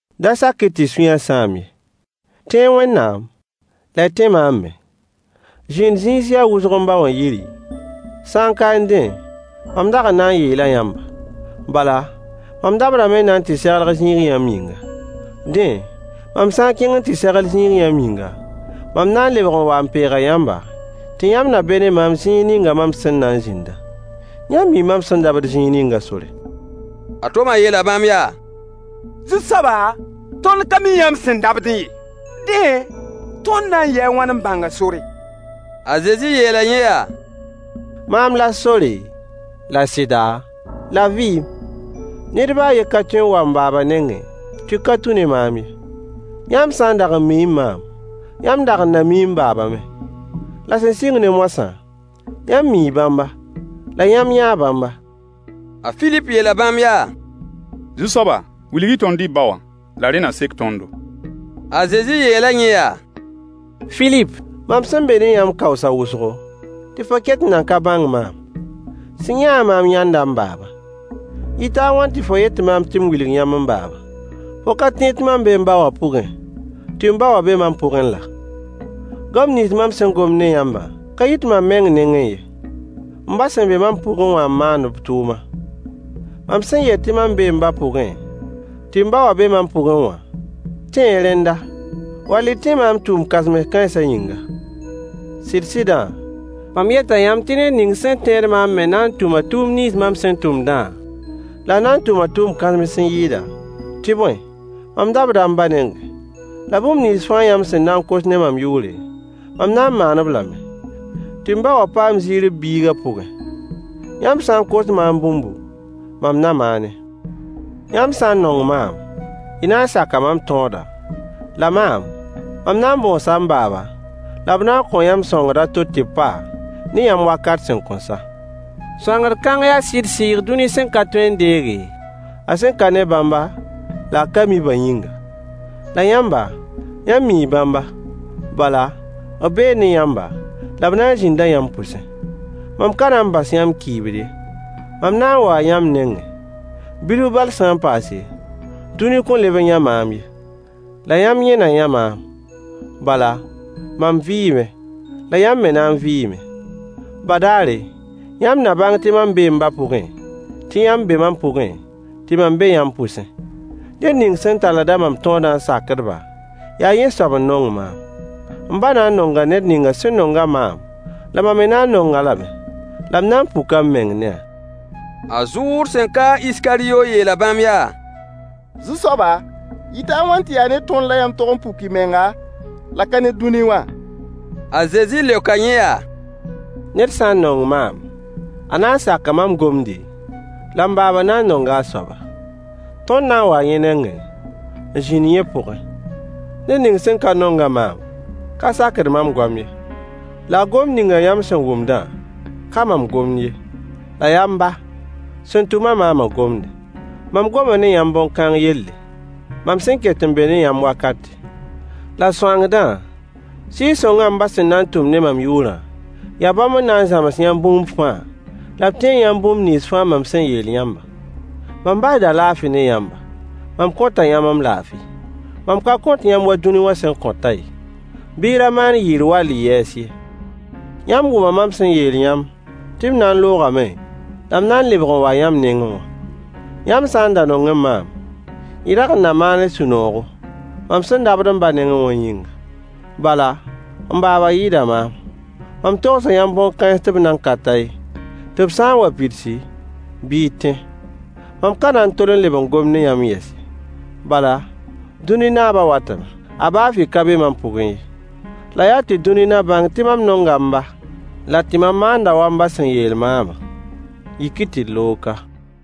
Da sak-y tɩ y sũyã sãam ye. Tẽ-y Wẽnnaam, la y tẽ maam me. Zĩnd-zĩis yaa wʋsg m ba wã yiri, sã kaẽ dẽ, mam dag n na n yeela yãmba. Bala, mam dabdame n na n tɩ segl zĩig yãmb yĩnga. Dẽ, mam sã n kẽng n tɩ segl zĩig yãmb yĩnga, mam na n lebg n waa n peega yãmba, tɩ yãmb na be ne maam zĩig ning mam sẽn na n zĩndã. Yãmb mii mam sẽn dabd zĩig ningã sore. A Toma yeela bãmb yaa: Zu-soaba, tõnd ka mi yãmb sẽn dabdẽ ye. Dẽ, tõnd na n yɩɩ a wãn n bãng a sore? A Zezi yeela yẽ yaa: Maam la sore, la sɩda, la vɩɩm. Ned baa a yen ka tõe n wa m baaba nengẽ tɩ ka tũ ne maam ye. Yãmb sã n dag n miẽ maam, yãmb dag n na miẽ m baaba me. La sẽn sɩng ne moasã, yãmb mii bãmba, la yãmb yãa bãmba. A Filip yeela bãmb yaa: Zu-soaba, wilg-y tõnd y ba wã, la rẽ na sek tõndo. A Zezi yeela yẽ yaa: Filip, mam sẽn be ne yãmb kaoosa wʋsgo, tɩ fo ket n nan ka bãng maam? Sẽn yã-a maam yãnda m baaba. Yɩta a wãn tɩ fo yet maam tɩ m wilg yãmb m baaba? Fo ka tẽed tɩ mam bee m ba wã pʋgẽ, tɩ m ba wã be mam pʋgẽ laa? Goam nins mam sẽn gomd ne yãmbã ka yit mam meng nengẽ ye. M ba sẽn be mam pʋgẽ wã n maand b tʋʋma. Mam sẽn yet tɩ mam bee m ba pʋgẽ, tɩ m ba wã be mam pʋgẽ wã, tẽ-y rẽnda, wall n tẽ maam tʋʋm kãsems kãensã yĩnga. Sɩd-sɩdã, mam yeta yãmb tɩ ned ning sẽn tẽed maam me na n tʋma tʋʋm nins mam sẽn tʋmdã, la a na n tʋma tʋʋm kãsems n yɩɩda, tɩ bõe, mam dabda m ba nengẽ, la bũmb nins fãa yãmb sẽn na kos ne mam yʋʋre, mam na n maan-b lame, tɩ m ba wã paam ziir b biigã pʋgẽ. Yãmb sã n kos maam bũmbu, mam na maane. Yãmb sã n nong maam, y na n saka mam tõodã, la maam, mam na n bõosa m baaba, la b na n kõo yãmb sõangd a to tɩ b pa ne yãmb wakat sẽn kõn sa. Sõangd kãng yaa sɩd Sɩɩg dũni sẽn ka tõe n deege, a sẽn ka ne bãmba la a ka mi-bã yĩnga. La yãmba, yãmb mii bãmba, bala, b bee ne yãmba, la b na n zĩnda yãmb pʋsẽ. Mam ka na n bas yãmb kɩɩbd ye, mam na n waa yãmb nengẽ. Bilf bal sã n paase, dũni kõn leb n yã maam ye. La yãmb yẽ na yã maam. Bala, mam vɩɩme, la yãmb me na n vɩɩme. Badaare, yãmb na bãng tɩ mam bee m ba pʋgẽ, tɩ yãmb be mam pʋgẽ, tɩ mam be yãmb pʋsẽ. Ned ning sẽn talld-a mam tõodã n sakd-ba, yaa yẽ soab n nong maam. M ba na n nonga ned ning sẽn nong-a maam, la mam me na n nong-a lame, la m na n puka m meng ne-a. A Zuud, sẽn ka a Iskaryo yeela bãmb yaa: Zu-soaba, yɩta a wãn tɩ yaa ne tõnd la yãmb tog n puk y menga, la ka ne dũni wã? A Zezi leoka yẽ yaa: Ned sã n nong maam, a na n saka mam gomde, la m baaba na n nonga a soaba. Tõnd na n waa yẽ nengẽ, n zĩnd yẽ pʋgẽ. Ned ning sẽn ka nong-a maam ka sakd mam goam ye. La gomd ning yãmb sẽn wʋmdã ka mam gomd ye, la yaa m ba, sẽn tʋm-a maamã gomde. Mam goma ne yãmb bõn-kãng yelle, mam sẽn ket n be ne yãmb wakate. La sõangdã, Sɩɩg-sõngã m ba sẽn na n tʋm ne mam yʋʋrã, yaa bãmb n na n zãms yãmb bũmb fãa, la b tẽeg yãmb bũmb nins fãa mam sẽn yeel yãmbã. Mam basda laafɩ ne yãmba. Mam kõta yãmb m laafɩ. Mam ka kõt yãmb wa dũni wã sẽn kõtã ye. Bɩ y ra maan yɩɩr wall y yɛɛs ye. Yãmb wʋma mam sẽn yeel yãmb tɩ m na n loogame la m na n lebg n waa yãmb nengẽ wã. Yãmb sã n da nongẽ maam, y dag n na maanẽ sũ-noogo, mam sẽn dabd m ba nengẽ wã yĩnga. Bala, m baaba yɩɩda maam. Mam togsa yãmb bõn-kãens tɩ b nan ka ta ye, tɩ b sã n wa n pidsi, bɩ y tẽ. Mam ka na n tol n leb n gom ne yãmb yɛs ye, bala, dũni naabã watame. A baa fɩ ka be mam pʋgẽ ye. La yaa tɩ dũni na bãng tɩ mam nonga m ba, la tɩ mam maanda wa m ba sẽn yeel maamã. Yik-y tɩ d loog ka.